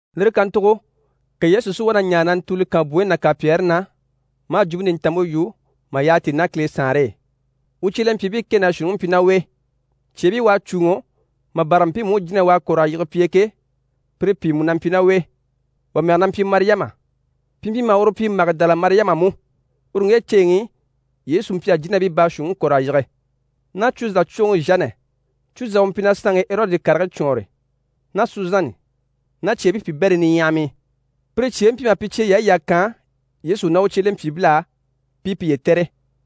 Lire kàntugo ka Yesu si wá na ɲaare na ntùuli kànbwoyi ná kànpyɛɛre na, maa Jwumpe Nintanmpe yu mà yyaha tíi ná Kile Saanre e. U cyelempyiibii kɛ ná shuunniŋi mpyi ná u e. Cyeebii u à cùuŋɔ, mà bâra mpiimu jínahii u à kɔ̀r'a yige pi e ke, pire pìi mú na mpyi ná u e. Wà mɛge na mpyi Mariyama, pi mpyi maha uru pyi Magidala Mariyama mú (uru ŋge ceeŋi i Yesu mpyi a jínabii baashuunniŋi kɔ̀r'a yige) ná Cwuza cwoŋi Zhanɛ (Cwuza u mpyi na saanŋi Erɔdi karigii cwɔɔnre) ná Suzani ná cyeebii piibɛrii niɲyahamii. Pire cyeebii mpyi maha pi cyeyaayi yà kaan Yesu ná u cyelempyiibil'á, pi i piye tɛ̀re.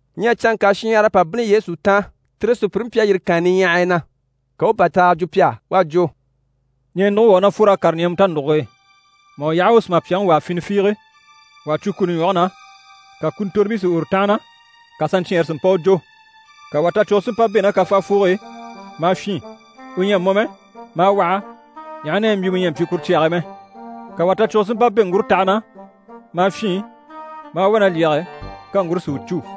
Ɲyɛ canŋka shinɲyahara à pa bínni Yesu taan, tire sùpyire mpyi a yîri kànya niɲyahaya na, ka u u bàtaaga jwo pi á. U à jwo: «Ɲɛɛnuguŋi wà u ná fwor'a kàre ɲɛɛmɛ tanuguge e. Mà u yaha u u sùmapyaŋi wàa fini fiige, wà à cwo kuni ɲwɔge na, ka kuntorobii si uru tánhana, ka saɲcyɛɛnre si mpa u jò. Ka wà tacwugo si mpa bɛ̂ ná kafaafoge e, maa fyîn. U ɲyɛ a mɔ mɛ, maa waha, ɲaha na yɛ mbyimɛ ɲyɛ a pyi kuru cyage e mɛ. Ka wà tacwugo si mpa bɛ̂ ŋgurotaha na, maa fyîn, maa wá na lyɛge, ka ŋgure si u cû.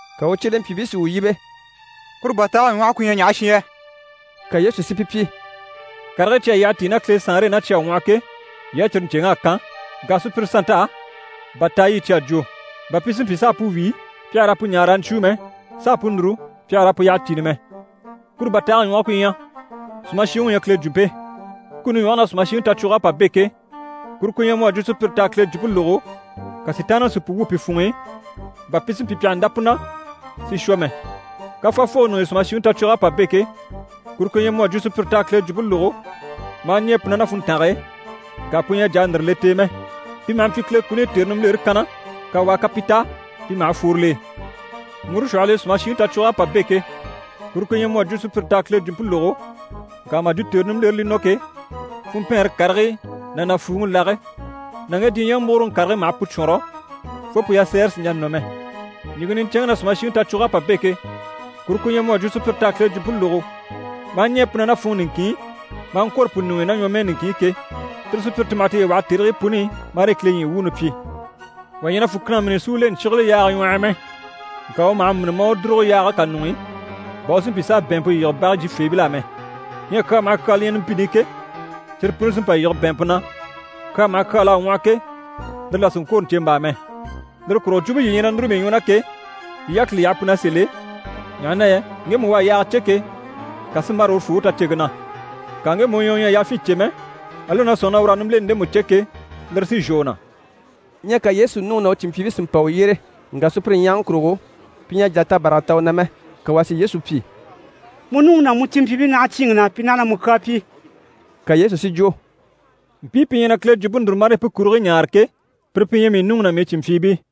Ka u cyelempyiibii si u yíbe: «Kuru bàtaage ɲwɔhe ku ɲyɛ ɲaha shi yɛ?» Ka Yesu si pi pyi: «Karigii cyi à yyaha tíi ná Kile Saanre e ná cyi à ŋwɔhɔ ke, yii á cyire ɲcèŋ'à kan, ŋka sùpyire sannt'á bàtaay'i cyi à jwo: “bà pi si mpyi s'a pu wíi, pi àha raa pu ɲaa raa ɲcwúu mɛ, s'a pu núru, pi àha raa pu yyaha cìni mɛ.” Kuru bàtaage ɲwɔhɔ ku ɲyɛ: sùmashiŋi u ɲyɛ Kile jwumpe. Kuni ɲwɔge na sùmashiŋi tacwug'à pa bɛ̂ ke, kuru ku ɲyɛ mu à jwo sùpyire t'à Kile jwumpe lógo, ka Sitaanniŋi si pu wwû pi funŋ'i, bà pi si mpyi pi àha ndá pu na, si shwɔ mɛ. Kafaafoge ɲuŋ'i sùmashiŋi tacwug'à pa bɛ̂ ke, kuru ku ɲyɛ mu à jwo sùpyire t'à Kile jwumpe lógo maa ɲɛɛ pu na ná funntange e, ŋka pu ɲyɛ a jà a ndìre le t'e mɛ. Pi maha mpyi Kile kuni i tère nimbilere e kanna, kawaa ká pi ta, pi maha fworo l'e. Ŋgure shwɔhɔl'e sùmashiŋi tacwug'à pa bɛ̂ ke, kuru ku ɲyɛ mu à jwo sùpyire t'à Kile jwumpe lógo, ŋka mà jwo tère nimbilere li nɔ ke, funmpɛɛnre karigii ná nàfuuŋi lage ná ŋge diɲyɛŋi múguroŋi karigii maha pu cwɔ̂nrɔ, fo pu yasɛɛre sì n‑jà nɔ mɛ. Ɲìŋke niɲcɛnŋke na sùmashiŋi tacwug'à pa bɛ̂ ke, kuru ku ɲyɛ mu à jwo sùpyire t'à Kile jwumpe lógo maa ɲɛɛ pu na ná funŋɔ niŋkin i, maa ŋkwôro pu ɲuŋ'i ná ɲwɔmɛɛ niŋkin i ke, tire sùpyire ti maha tiye waha tèrigii puni i, marii Kile ɲyii wuuni pyi. Wà ɲyɛ na fùkina mîni si u le ɲcyígile yaaga ɲwɔh'i mɛ. Ŋka u maha mîni maa u dùrugo yaage kà ɲuŋ'i, bà u si mpyi s'a bɛ̀ɛnmpe yige bage jyifeebil'á mɛ. Ɲyɛ kyaa maha kyaa li ɲyɛ numpini i ke, cyire puni sí n‑pa n‑yige bɛ̀ɛnmpe na, kyaa maha kyaa l'à ŋwɔhɔ ke, lire là sì n‑kwôro ɲcèmbaa mɛ. Lire kurugo jwumpe yii ɲyɛ na núru mii ɲwɔ na ke, yii yákili yaha pu na sèl'e, ɲaha na yɛ ŋgemu u à yaaga cè ke, kà sí n‑bâra urufoo u taceŋke na. Ŋka ŋgemu u ɲyɛ u ɲyɛ a yafyin cè mɛ, ali u na sɔ̂nŋi na ur'à nimbileni ndemu cè ke, lire sí n‑shwɔ u na.» Ɲyɛ ka Yesu nuŋi ná u cìnmpyiibii si mpa u yyére. Ŋka sùpyire ɲyahaŋi kurugo, pi ɲyɛ a jà a tabaraga ta u na mɛ. Ka wà si Yesu pyi: «Mu nuŋi ná mu cìnmpyiibii naha cyíinŋi na, pi naha na mu kyaa pyi.» Ka Yesu si jwo: «Mpii pi ɲyɛ na Kile jwumpe núru, marii pu kurigii ɲaare ke, pire pi ɲyɛ mii nuŋi ná mii cìnmpyiibii.»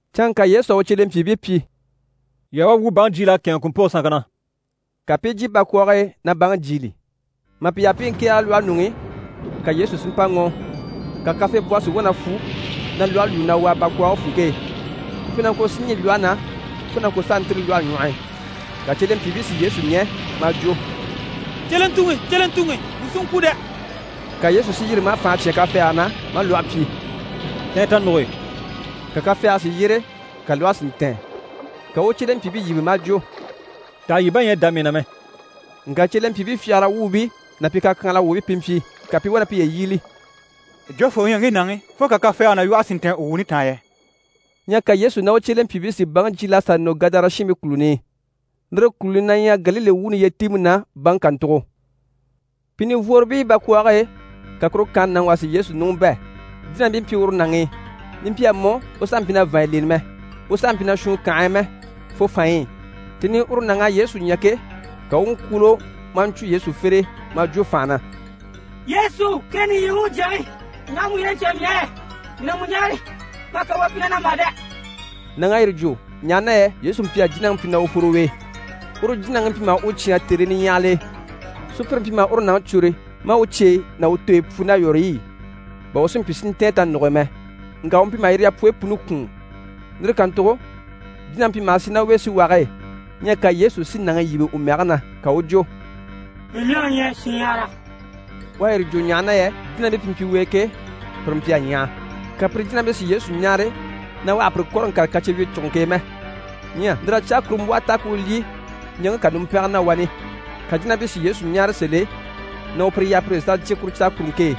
Canŋka Yesu à u cyelempyiibii pyi: «Yii a wá, wuu u baŋi jyiil'a kɛ̂ɛnŋɛ kùmpoge sanŋke na.» Ka pi i jyé bakwɔɔge e na baŋi jyiili. Mà pi yaha pi i ŋkɛ̀ɛge lwɔhe ɲuŋ'i, ka Yesu si mpa ŋɔ́ɔ, ka kafeebwɔhɔ si wá na fwu na lwɔhe lwúu na wàa bakwɔɔge funŋke e. Ku mpyi na ŋko si ɲî lwɔhe na, fo na ŋko s'a ntîri lwɔhe ɲwɔh'i. Ka cyelempyiibii si Yesu ɲɛ̀, maa jwo: «Cyelentuŋi, cyelentuŋi, wuu sí n‑kwû dɛ!» Ka Yesu si yîri maa fànha cyán kafɛɛge na, maa lwɔhe pyi: «Tɛ̀ɛn tanuge e!» Ka kafɛɛge si yyére, ka lwɔhe si ntɛ̀ɛn. Ka u u u cyelempyiibii yíbe maa jwo: «Taha yii bá ɲyɛ a dá mii na mɛ?» Ŋka cyelempyiibii fyagara wuubii ná pi kakyanhala wuubii pi mpyi, ka pi i wá na piye yíbili: «Jofoo u ɲyɛ ŋge nàŋi fo ka kafɛɛge ná lwɔhe si ntɛ̀ɛn u wuuni taan yɛ?» Ɲyɛ ka Yesu ná u cyelempyiibii si baŋi jyiil'a sà nɔ Gadara shiinbii kùluni i, lire kùluni na ɲyɛ Galile wuuni yyetiimpe na baŋi kàntugo. Pi nivworobii bakwɔɔge e, ka kuru kànhe nàŋi wà si Yesu ɲùŋɔ bɛ̂, jínabii mpyi uru nàŋi i. Li mpyi a mɔ, u sàha mpyi na vàanɲyi leni mɛ, u sàha mpyi na shùun kànhe e mɛ, fo fanɲyi i. Tèni i uru nàŋ'à Yesu ɲya ke, ka u u ŋkwúulo, maa ɲcwo Yesu fere e, maa jwo fànha na: «Yesu, Kileŋi nìɲyi wuŋi Jyaŋi, ɲaha mu ɲyɛ na ɲcaa mii á yɛ? Mii na mu ɲáare, ma hà kawaa pyi na na mà dɛ!» Nàŋ'à yire jwo, ɲaha na yɛ Yesu mpyi a jínaŋi pyi na u fworo u e. Uru jínaŋi mpyi maha u cyáan tèrii niɲyahagil'e. Sùpyire mpyi maha uru nàŋi cwôre maa u cyeyi ná u tooyi pwu ná yɔ̀rɔy'e, bà u si mpyi si ntɛ̀ɛn tanuge e mɛ, ŋka u mpyi maha yire yapwoyi puni kwùun. Lire kàntugo jínaŋi mpyi maha sì ná u e síwage e. Ɲyɛ ka Yesu si nàŋi yíbe u mɛge na, ka u u jwo: «Mii mɛge ɲyɛ Shinɲyahara.» U à yire jwo ɲaha na yɛ jínabii pi mpyi u e ke, pire mpyi a ɲyaha. Ka pire jínabii si Yesu ɲáare na u àha pire kɔ̀rɔ ŋkàre kacyewyicuguŋke e mɛ. Ɲyɛ lir'à caakurumbwɔhɔ ta ku u lyî ɲaŋke kà numpɛngɛ na wani, ka jínabii si Yesu ɲáare sèl'e na u pire yaha pire pi sà jyè kuru caakuruŋke e,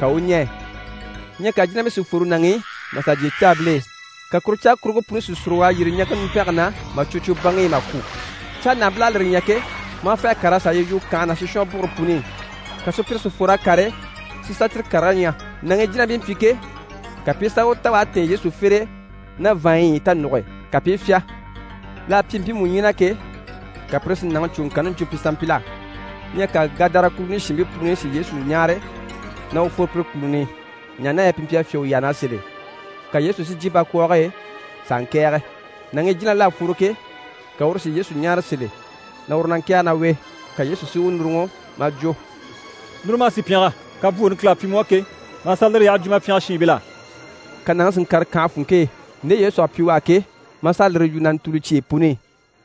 ka u u ɲɛɛ. Ɲyɛ ka jínabii si fworo nàŋi i maa sà jyè caabil'e. Ka kuru caakuruŋke puni si sùrug'a yîri ɲaŋke numpɛnge na mà cwo cwo baŋi i mà kwû. Cáanahabil'à lire ɲya ke, maa fê a kàr'a sà a yi yu kànhe ná sishwɔnbugure puni i. Ka sùpyire si fwor'a kàre si sà cyire karigii ɲya. Nàŋi i jínabii mpyi ke, ka pi i sà u ta u à tɛ̀ɛn Yesu fere e ná vàanɲyi i tanuge e, ka pi i fyá. L'à pyi mpiimu ɲyii na ke, ka pire si nàŋi cuuŋɔŋkanni jwo pi sanmpil'á. Ɲyɛ ka Gadara kùluni shiinbii puni si Yesu ɲáare na u fworo pire kùluni i, ɲaha na yɛ pi mpyi a fyá u yyaha na sèl'e. Ka Yesu si jyè bakwɔɔge e s'a ŋkɛ̀ɛge. Nàŋi i jínabil'à fworo ke, ka uru si Yesu ɲáare sèl'e, na uru na ŋkɛ̀ɛge ná u e. Ka Yesu si u núruŋɔ maa jwo: «Núru, ma a sì pyɛngɛ, kabwooni Kile à pyi mu á ke, ma a sà lire yyaha jwo ma pyɛngɛ shiinbil'á.» Ka nàŋi si ŋkàre kànhe funŋke e, nde Yesu à pyi u á ke, maa sà a lire yu na ntùuli cyeyi puni i.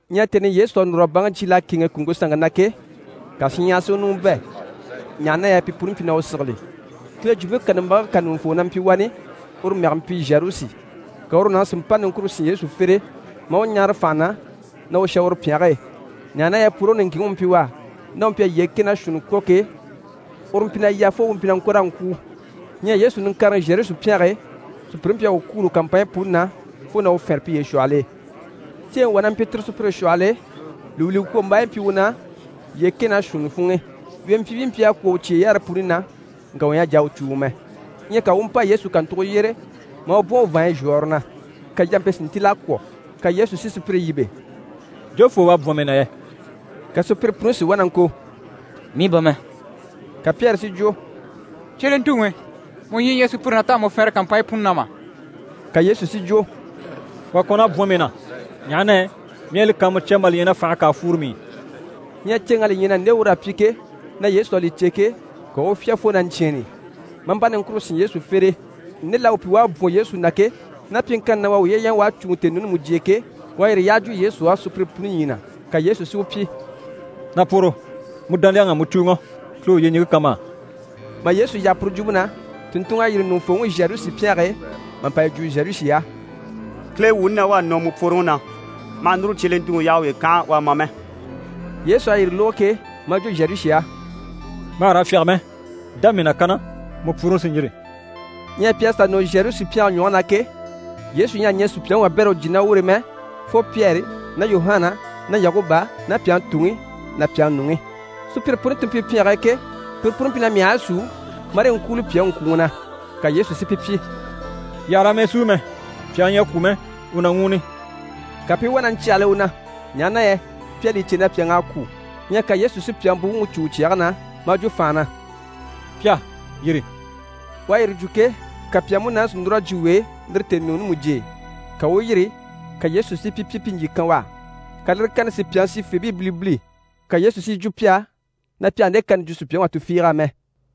Ɲyɛ tèni i Yesu à núr'a baŋi jyiil'a kɛ̂ɛnŋɛ kùŋke sanŋke na ke, ka shinɲyahara si u ɲùŋɔ bɛ̂, ɲaha na yɛ pi puni mpyi na u sigili. Kile Jwumpe kàlambage kà ɲùŋufoo na mpyi wani, uru mɛge mpyi Zharusi, ka uru nàŋi si mpa niŋkure sín Yesu fere e maa u ɲáare fànha na na u shà uru pyɛnge e, ɲaha na yɛ pworoŋi niŋkinŋi u mpyi u á, ná u mpyi a yyee kɛ ná shuunni kwɔ̀ ke, uru mpyi na yà, fo u mpyi na ŋko raa ŋkwûu. Ɲyɛ Yesu niŋkareŋi Zharusi pyɛnge e, sùpyire mpyi a u kwûulo kàmpanɲyi puni na, fo na u fɛnre piye shwɔhɔl'e. Ceeŋi wà na mpyi tire sùpyire shwɔhɔl'e, lùwuliŋkwombaayi mpyi u na yyee kɛ ná shuunni funŋ'i. Wempyiibii mpyi a kwɔ̀ u cyeyaare puni na, ŋka wà ɲyɛ a jà a u cùuŋɔ mɛ. Ɲyɛ ka u u mpa Yesu kàntugo yyére maa bwɔ̀n u vàanɲyi zhwɔ̀ɔre na, ka yampe si ntíl'a kwɔ̀. Ka Yesu si sùpyire yíbe: «Jofoo u à bwɔ̀n mii na yɛ?» Ka sùpyire puni si wá na ŋko: «Mii bà mɛ.» Ka Pyɛri si jwo: «Cyelentuŋi, mu ɲyii ɲyɛ sùpyire na t'à mu fɛnrɛ kàmpanɲyi puni na mà?» Ka Yesu si jwo: «Wà kɔn'à bwɔ̀n mii na, ɲaha na yɛ mii à li kàanmucya mà li ɲya na fànhe kà a fworo mii i.» Ɲyɛ ceeŋ'à li ɲya na nde ur'à pyi ke, na Yesu à li cè ke, ka u u fyá fo na ɲcyɛ̂ɛnni, maa mpa niŋkure sín Yesu fere e, nde l'à u pyi u à bwɔ̀n Yesu na ke, ná pyiŋkanni na u à uye ɲya u à cùuŋɔ tèenuuni mujye e ke, u à yire yyaha jwo Yesu á sùpyire puni ɲyii na. Ka Yesu si u pyi: «Na pworo, mu dániyaŋ'à mu cùuŋɔ. Kile u yyeɲiŋke kan ma á.» Mà Yesu yaha puru jwumpe na, tùnntunŋ'à yîri ɲùŋufooŋi Zharusi pyɛnge e mà pa yi jwo Zharusi á: «Kile wuuni na wá à nɔ mu pworoŋi na. Ma hà núru cyelentuŋi yaha u uye kànha u a ma mɛ.» Yesu à yire lógo ke, maa jwo Zharusi á: «Ma hà raa fyáge mɛ, dá mii na kanna, mu pworoŋi sí n‑yîri.» Ɲyɛ pi à sà nɔ Zharusi pyɛnge ɲwɔge na ke, Yesu ɲyɛ a ɲɛɛ sùpyaŋi wabɛrɛ u jyè ná ur'e mɛ, fo Pyɛri ná Yuhana ná Yakuba ná pyàŋi tuŋi ná pyàŋi nuŋi. Sùpyire puni ti mpyi pyɛnge e ke, pire puni mpyi na myahigii súu marii ŋkwúuli pyàŋi ŋkwùŋi na. Ka Yesu si pi pyi: «Yii àha raa mɛɛ súu mɛ, pyàŋi ɲyɛ a kwû mɛ, u na ŋwúuni!» Ka pi i wá na ɲcyàhali u na, ɲaha na yɛ pi à li cè na pyàŋ'à kwû. Ɲyɛ ka Yesu si pyàŋi buwuŋi cû u cyɛge na, maa jwo fànha na: «Pyà, yîri!» U à yire jwo ke, ka pyàŋi múnaani si núr'a jyè u e, lire tèenuuni mujye e, ka u u yîri, ka Yesu si pi pyi pi ɲjyì kan u á. Ka lire kani si pyàŋi sifeebii bilibili. Ka Yesu si yi jwo pi á na pi àha nde kani jwo sùpyaŋi wà tufiig'á mɛ.